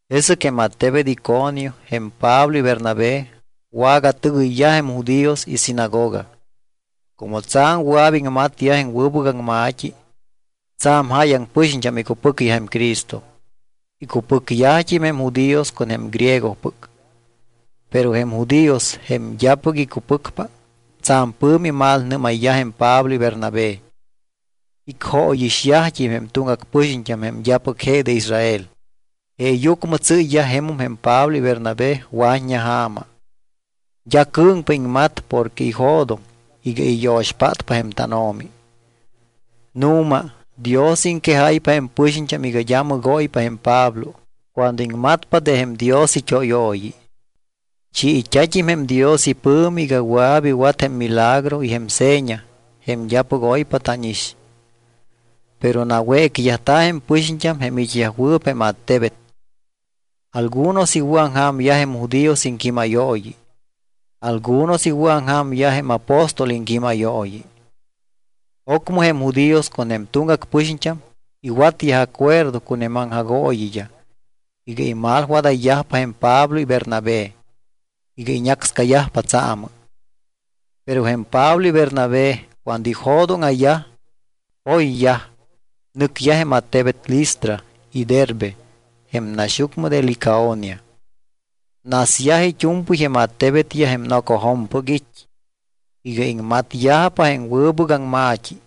Jesɨc jém attebet Iconio jém Pablo y Bernabé wagatɨgɨyyaj jém judíos isinagoga. Como tsa̱m wɨa̱p iŋmatyaj jém wɨbɨc aŋma̱t́i, tsa̱m jáyaŋ pɨxiñt́am icupɨcyaj jém Cristo. Icupɨcyajt́im jém judíos con jém griegopɨc. Pero jém judíos, jém d́apɨc icupɨcpa, tsa̱m pɨ̱mi imalnɨ́mayyaj jém Pablo y Bernabé. Icjóyixyajt́im jém tuŋgac pɨxiñt́am jém d́apɨc je de Israel. Jeeyucmɨ tsɨ́yyaj jemum jém Pablo y Bernabé wa̱t́ña ja̱ma. D́a cɨ̱ŋpa iŋmat porque ijo̱doŋ iga iyo̱xpátpa jém tánO̱mi. Nu̱ma Dios iŋquejáypa jém pɨxiñt́am iga d́a mɨgóypa jém Pablo cuando iŋmatpa de jém Dios it́óyooyi. Chiit́a̱t́im jém Dios ipɨ̱mi iga wɨa̱p iwat jém milagro y jém seña jém d́apɨc oypa tánix. Pero nawécyajta̱ jém pɨxiñt́am jém it́yajwɨɨp jém attebet. Algunos iwɨ̱aŋja̱myaj jém judíos iŋquímayooyi, algunos iwɨ̱aŋja̱myaj jém apóstol iŋquímayooyi. Ocmɨ jém judíos con jém tuŋgac pɨxiñt́am iwatyaj acuerdo con jém aŋjagooyiyaj iga imalwadayyajpa jém Pablo y Bernabé, iga iñácscayajpa tsaamɨ. Pero jém Pablo y Bernabé cuando ijo̱dóŋa̱yaj, poyyaj, nɨcyaj jém attebet Listra y Derbe jém naxyucmɨ de Licaonia. Nasyaj it́u̱mpɨy jém attebetyaj jém nocojo̱mpɨc it́ iga iŋmatyajpa jém wɨbɨc aŋma̱t́i.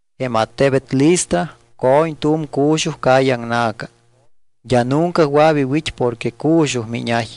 Jém attebet Listra co̱ñ tu̱m cu̱xuj calle aŋna̱ca. D́a nunca wɨa̱p iwit́ porque cu̱xuj miñay.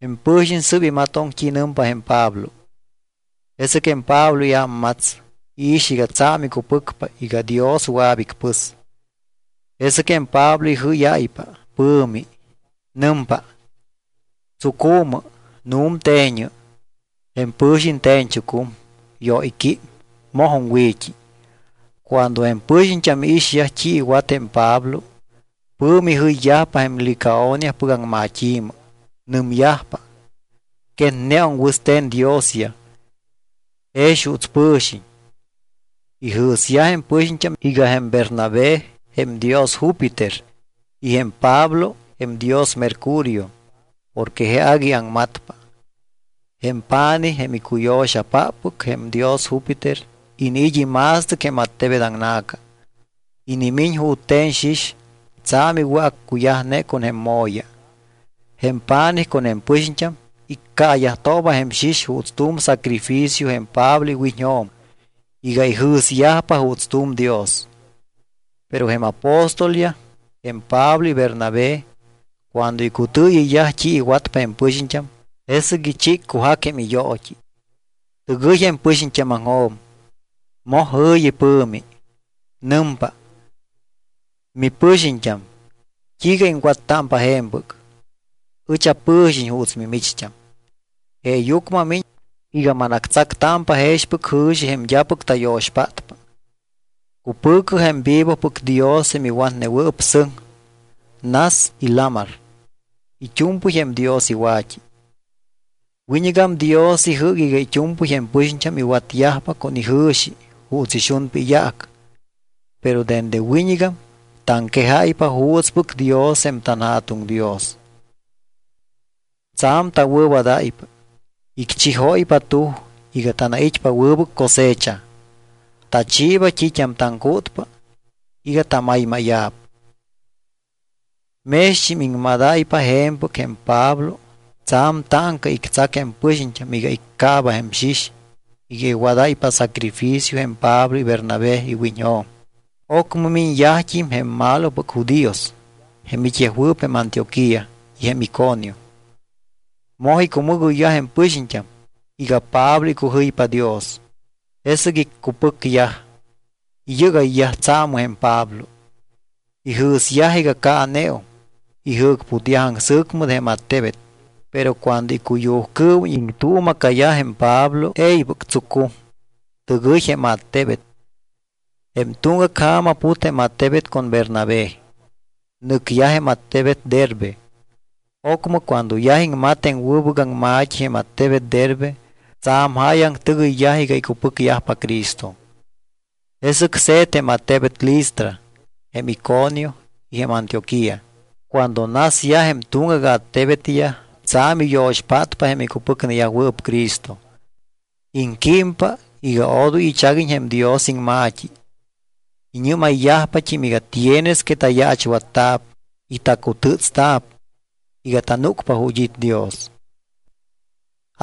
Jém pɨ̱xiñ sɨ́p imatoŋ t́i nɨmpa jém Pablo. Jesɨc jém Pablo iámmats, iix iga tsa̱m icupɨcpa iga Dios wɨa̱p icpɨs. Jesɨc jém Pablo ijɨ́yáypa pɨ̱mi. Nɨmpa: —¡Tsucu̱mɨ, nu̱mte̱ñɨ! Jém pɨ̱xiñ te̱ñchucum, yóyquím, mojum wi̱t́i. Cuando jém pɨxiñt́am iixyaj t́i iwat jém Pablo, pɨ̱mi jɨyyajpa jém Licaoniapɨc aŋmat́i̱mɨ. Nɨmyajpa: —Quetneum wɨste̱n diosyaj, jex juuts pɨ̱xiñ. Ijɨ̱syaj jém pɨxiñt́am iga jém Bernabé jém dios Júpiter y jém Pablo jém dios Mercurio porque je agui aŋmatpa. Jém pa̱nij, jém icuyo̱xapáppɨc jém dios Júpiter, iniit́ ima̱stɨc jém attebet aŋna̱ca. Inimiñ jute̱n xix tsa̱m iwɨ̱accuyajne con jém mo̱ya. Jém pa̱nij con jém pɨxiñt́am iccaayajtooba jém xix juuts tu̱m sacrificio jém Pablo iwiñjo̱m iga ijɨ̱syajpa juuts tu̱m dios. Pero jém apóstolyaj, jém Pablo y Bernabé, cuando icutɨɨyɨyyaj t́i iwatpa jém pɨxiñt́am, jesɨc ichiccujac jém iyoot́i. Tɨgɨy jém pɨxiñt́ámaŋjo̱m, moj jɨ̱yi pɨ̱mi. Nɨmpa: —¡Mipɨxiñt́am! ¿T́iiga iŋwattámpa je̱mpɨc? Ɨch apɨ̱xiñ juuts mimicht́am. Jeeyucmɨ amiñ iga manactsactámpa jexpɨc jɨ̱xi jém d́apɨc tayo̱xpátpa. Cupɨ̱cɨ jém vivopɨc Dios jém iwatnewɨɨp sɨŋ, nas y lamar. It́u̱mpɨy jém Dios iwa̱t́i. Wiñɨgam Dios ijɨ́c iga it́u̱mpɨy jém pɨxiñt́am iwatyajpa con ijɨ̱xi juuts ixunpa iyaac. Pero dende wiñɨgam taŋquejáypa juutspɨc Dios jém tanJa̱tuŋ Dios. Tsa̱m tawɨ̱wadáypa. Icchijóypa tuj iga tanait́t́ámpa wɨbɨc cosecha. Tachiiba t́it́am taŋcútpa iga tamaymáya̱p. Mext́im iŋmadáypa je̱mpɨc, jém Pablo tsa̱m táŋca ictsac jém pɨxiñt́am iga iccaaba jém xix iga iwadáypa sacrificio jém Pablo y Bernabé iwiñjo̱m. Ocmɨ miñyajt́im je̱m jém malopɨc judíos, jém it́yajwɨɨp jém Antioquía y jém Iconio. Moj icumɨgoyyaj jém pɨxiñt́am iga Pablo icujɨypa Dios. Jesɨc iccupɨcyaj, iyɨgayyaj tsaamɨ jém Pablo. Ijɨ̱syaj iga caaneum. Ijɨ̱cputyaj aŋsɨ̱cmɨ de jém attebet. Pero cuando icuyujcɨɨwiñ iŋtuuma̱cayaj jém Pablo, e̱ybɨc tsucum, tɨgɨy jém attebet. Jém tuŋgac ja̱ma put jém attebet con jém Bernabé, nɨcyaj jém attebet Derbe. Ocmɨ cuando yaj iŋmat jém wɨbɨc aŋma̱t́i jém attebet Derbe, tsa̱m jáyaŋ tɨgɨyyaj iga icupɨcyajpa Cristo. Jesɨc se̱t jém attebet Listra, jém Iconio y jém Antioquía. Cuando nasyaj jém tuŋgac attebetyaj tsa̱m iyo̱xpátpa jém icupɨcneyajwɨɨp Cristo. Iŋquímpa iga odoy ichaguiñ jém Dios iŋma̱t́i. Iñɨ́mayyajpat́im iga tienes que tayaachwatta̱p y tacutɨtsta̱p iga tanúcpa ju̱t́ it́ Dios.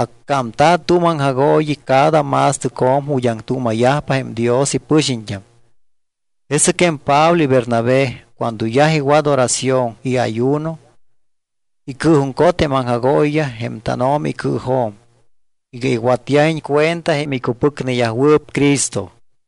Accámta̱ tu̱m aŋjagooyi cada ma̱stɨcjo̱m ju̱t́ aŋtuuma̱yajpa jém Dios ipɨxiñt́am. Jesɨc jém Pablo y Bernabé cuando yaj iwat oración y ayuno, icɨɨjuŋcot jém aŋjagooyiyaj jém tánO̱mi icɨɨjo̱m iga iwatyajiñ cuenta jém icupɨcneyajwɨɨp Cristo.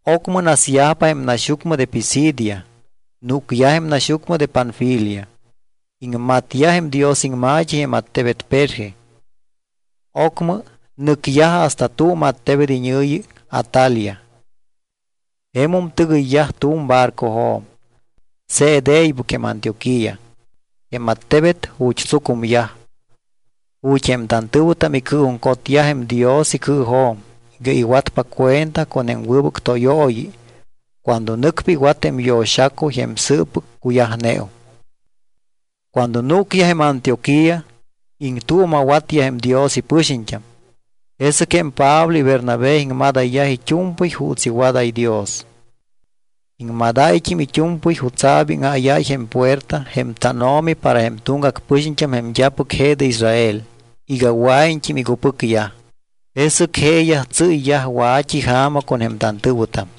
Ocmɨ nasyajpa jém naxyucmɨ de Pisidia, núcyaj jém naxyucmɨ de Panfilia. Iŋmatyaj jém Dios iŋma̱t́i jém attebet Perge. Ocmɨ nɨcyaj hasta tu̱m attebet iñɨ̱yi Atalia. Jemum tɨgɨyyaj tu̱m barcojo̱m. Se̱t e̱ybɨc jém Antioquía, jém attebet ju̱t́ tsucumyaj, ju̱t́ jém tantɨ̱wɨtam icɨɨjuŋcotyaj jém Dios icɨɨjo̱m iga iwatpa cuenta con jém wɨbɨc tóyooyi cuando nɨcpa iwat jém yo̱xacuy jém sɨɨppɨc cuyajneum. Cuando núcyaj jém Antioquía, iŋtuuma̱watyaj jém Dios ipɨxiñt́am. Jesɨc jém Pablo y Bernabé iŋmadayyaj it́u̱mpɨy juuts iwadáy Dios. Iŋmadáyt́im it́u̱mpɨy jutsa̱p íŋáyáy jém puerta jém tánO̱mi para jém tuŋgac pɨxiñt́am jém d́apɨc je de Israel iga wɨa̱iñt́im icupɨcyaj. Jesɨc jeeyaj tsɨ́yyaj wa̱t́i ja̱ma con jém tantɨ̱wɨtam.